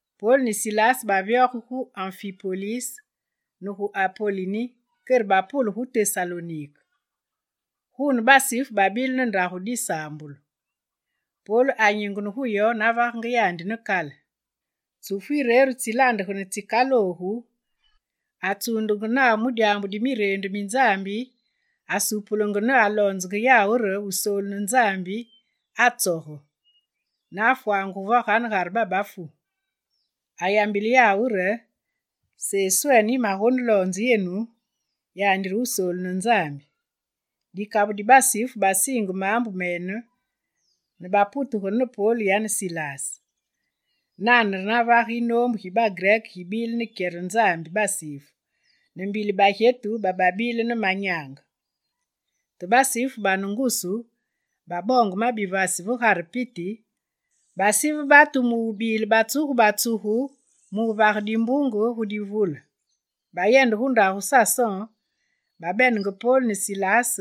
Pol ne Silas bavyoge gu Anfipolis, ne gu Apolini kere bapule gu Tesalonike. Guune, basifu babile ne ndagu disaambulu. Pol anyingene gu yo navagenge yandi ne kale. Tsufu yireru tsilaandegane tsikaloogu, atsuundenge nawu mu dyaambu di Mireendu mi Nzambi, asupulenge ne aloonzenge yawu re Wusoolu ne Nzambi atsoge, ne afwangugu va ganegare babafu. Ayambile yawu re: «Seswene yimagoneloonze yenu, yandi re Wusoolu ne Nzambi.» Dikabu di basifu basiinge maambu mene, ne baputegene ne Pol yane Silas. Nane re navage yinoombu gi bagrek gibile ne kyere Nzambi basifu, ne mbili bagyetu bababile ne manyaange. Te basifu bane ngusu baboonge ma bivasi ve Gugare piti, basive batu mubile batsugu batsugu mu wuvage dimbunge gu divule. Bayende gu ndagu Sason, babenenge Pol ne Silas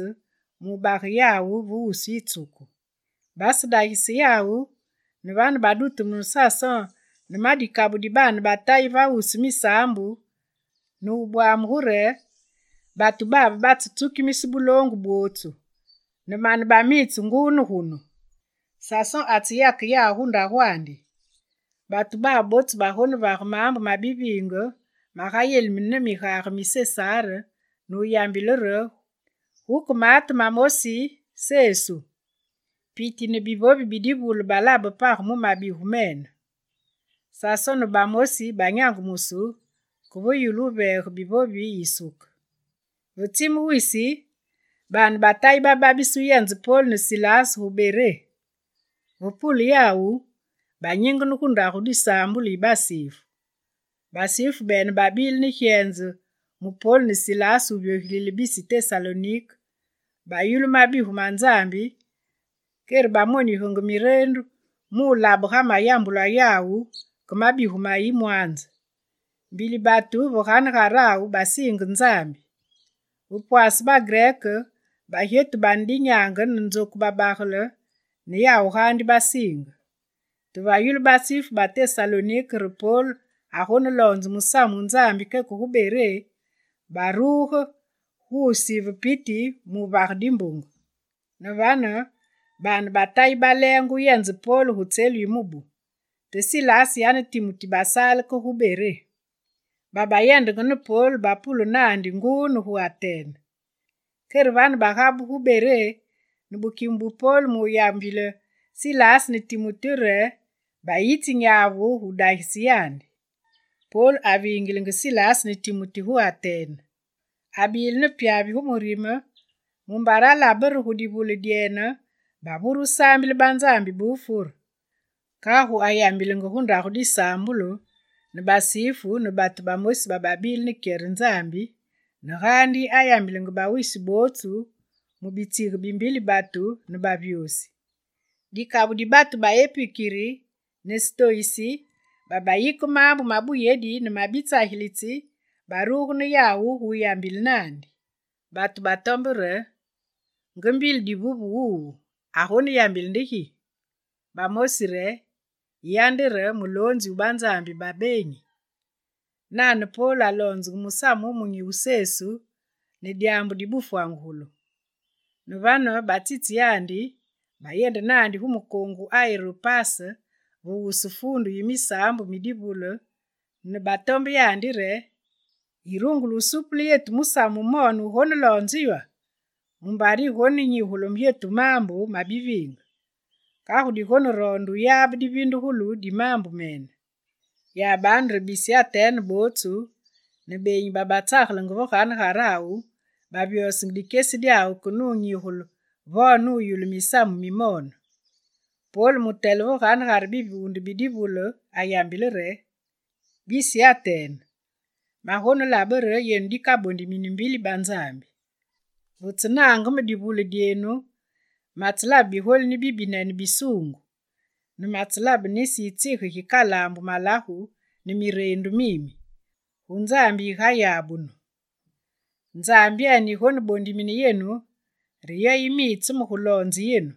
mu wubage yawu ve wusu yitsuku. Basedagise yawu, ne vane badutumune Sason ne ma dikabu di baane ba Tayi va wusu misaambu ne wubwamugu re: «Batu babe batsetsukimise buloongu bwootsu, ne mane bamitse nguu ne gunu, Sason atseyake yawu gu ndagwandi. Batu babe bootsu bagonevage maambu ma biviindige, magayelimine ne migage mi Sesar ne wuyambile re guke maate mamosi, Sesu.» Piti ne bivovi bi divule balabe page mu mabigu mene. Sason ne bamosi banyangumusu ke ve yulu wuveege bivovi yisuke. Ve tsime wisi, baane ba Tayi bababise wuyenze Pol ne Silas gu Beré. Ve pule yawu, banyingene gu ndagu disaambulu yi basifu. Basifu bene babile ne gyenze mu Pol ne Silas vyogilile bisi Tesalonike, bayulu mabigu ma Nzambi, kere bamonigenge Mireendu, mu wulabe ga mayambulwa yawu ke mabigu ma yimwanze. Mbili batu ve ganegarawu basiinge Nzambi. Ve pwaase bagrek, bagyetu bane dinyaange, ne nzoku babagele ne yawu gaandi basiinge. Te ve yulu basifu ba Tesalonike re Pol agoneloonze musamu wu Nzambi keke gu Beré, baruge gu wusive piti mu wuvage dimbunge. Ne vane baane ba Tayi baleenge wuyenze Pol gu tselu yi mubu; te Silas yane Timuti basaale ke gu Beré. Babayendenge ne Pol bapule naandi nguu ne gu Atene. Kere vane bagabugu gu Beré, ne bukime bu pol mu wuyambile Silas ne Timuti re bayitsi nyavu gu wudagise yandi. Pol avingilenge Silas ne Timuti gu Atene. Abile ne pyavi gu murime mumbare alabe re gu divule dyene, bavure saambile banzambi ba wufure. Kagu ayambilenge gu ndagu disaambulu ne basifu ne batu bamosi bababile ne kyere Nzambi, ne gaandi ayambilenge bawisi bootsu mu bitsige bi mbili batu, ne bavyosi. Dikabu di batu ba epukiri ne stoyisi, babayike maambu ma buyedi ne ma bitsagilitsi baruge ne yawu gu wuyambile naandi. Bane batombe re: «Nge mbili divuve wuwu, agoneyambile nde gi?» Bamosi re: «Yiya nde re, muloonzi wu banzambi ba beenyi.» Nane, Pol aloonzenge musamu wumunyi wu Sesu ne dyaambu di bufwangugulu. Ne vane batsitse yandi, bayende naandi gu mukoongu Aeropase, ve wusu Fuundu yi misaambu mi divule, ne batombe yandi re: «Yirungule wusuupule yetu musamu wumoone wugoneloonze ywa? Mumbare yigonenyigule yetu maambu mabiviinge. Kagu digoneroonde wuyabe divindugulu di maambu mene.» Yabanu re bisi Atene bootsu ne beenyi babatsagelenge va ganegarawu bavyosenge dikyesi dyawu ke ne wunyigule vo ne wuyulu misamu mimoone. Pol, mutele ve ganegare bivuunde bi divule ayambile re: «Bisi Atene, magonelabe re yenu dikabondimini mbili banzambi. Ve tsenaange me divule dyenu, matselabe bigolini bibinene bisuungu, ne matselabe nisi yitsige gikalaambu malagu ne mireendu mimi: “Gu nzambi yigayabunu.” Nzambyene yigonebondimine yenu, re yo yimitse me guloonze yenu.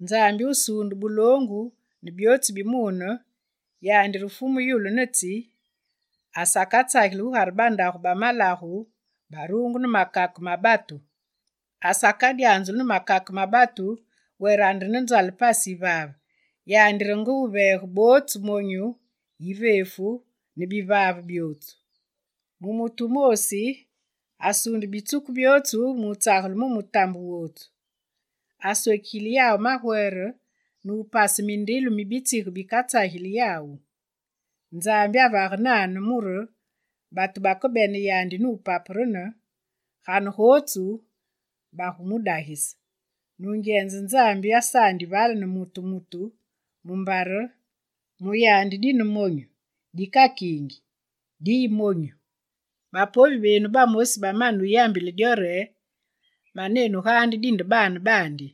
Nzambi wusuunde buloongu ne byootsu bi mune, yandi re Fumu yulu ne tsi, asakatsageli gugare bandagu ba malagu baruungu ne makake ma batu; asakadyanzulu ne makake ma batu were ande ne nzale pasi yivaave, yandi re nge wuveege bootsu monyu, iveefu ne bivaave byootsu. Mu mutu wumoosi, asuunde bitsuku byootsu mu wutsagele mu mutambe wootsu. Aswekigile yawu magwere ne wupase mindilu mi bitsige bikatsageli yawu. Nzambi avage nane mure batu bakebene yandi ne wupaperene, ganegotsu bagumudagise. Nungyenze Nzambi asaandi vale ne mutu mutu, mumbare: “Mu yandi dine monyu, dikakiingi, diyi monyu.” Bapovi benu bamosi bamane wuyambile dyo re: “Manenu gaandi dinde baane baandi.”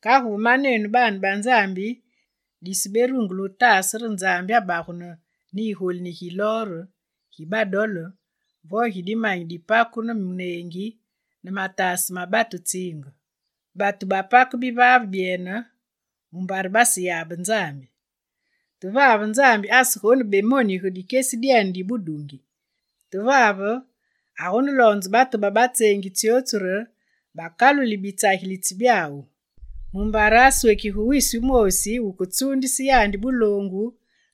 Kagu ve manenu baane ba Nzambi, diseberungule wutaase re Nzambi abagunu ne igolini gi lor, gi badole vo ne dimanyi bipaku ne muneengi ne mataase ma batu tsiinge. Batu bapake bivaave byene mumbare baseyabe Nzambi. Te Nzambi asegonebemonige dikyesi dyene di budungi. Te vave, agoneloonze batu bootsu ba batseengi tsyootsu re bakaluli bitsagilitsi byawu. Mumbare aswekige wisi wumoosi wuketsuundise yandi buloongu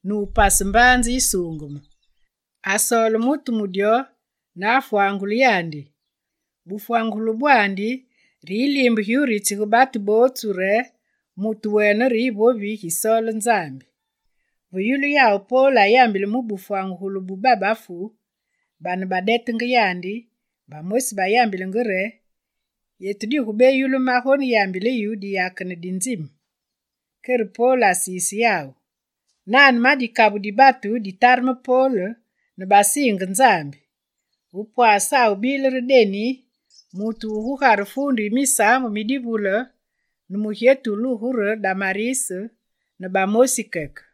ne wupase mbaanze yisuungeme. Asoole mutu mu dyo, ne afwangule yandi. Bufwangugulu bwandi re yiliimbe giwuritsige gu bootsu re mutu wene re yivovi gisoole Nzambi.» Ve yulu yawu Pol ayambile mu di bufwangugulu bu babafu, bane badetenge yandi, bamosi bayambilenge re: «Yetu digubeyulu magoneyambile yu diyakene di nzime.» Kere Pol asise yawu. Nane ma dikabu di batu batareme Pol, ne basiinge Nzambi: Ve pwasawu bile re Denis, mutu wu gugare Fuundu yi misaambu mi divule, ne mugyetu wulugu re Damaris, ne bamosi keke.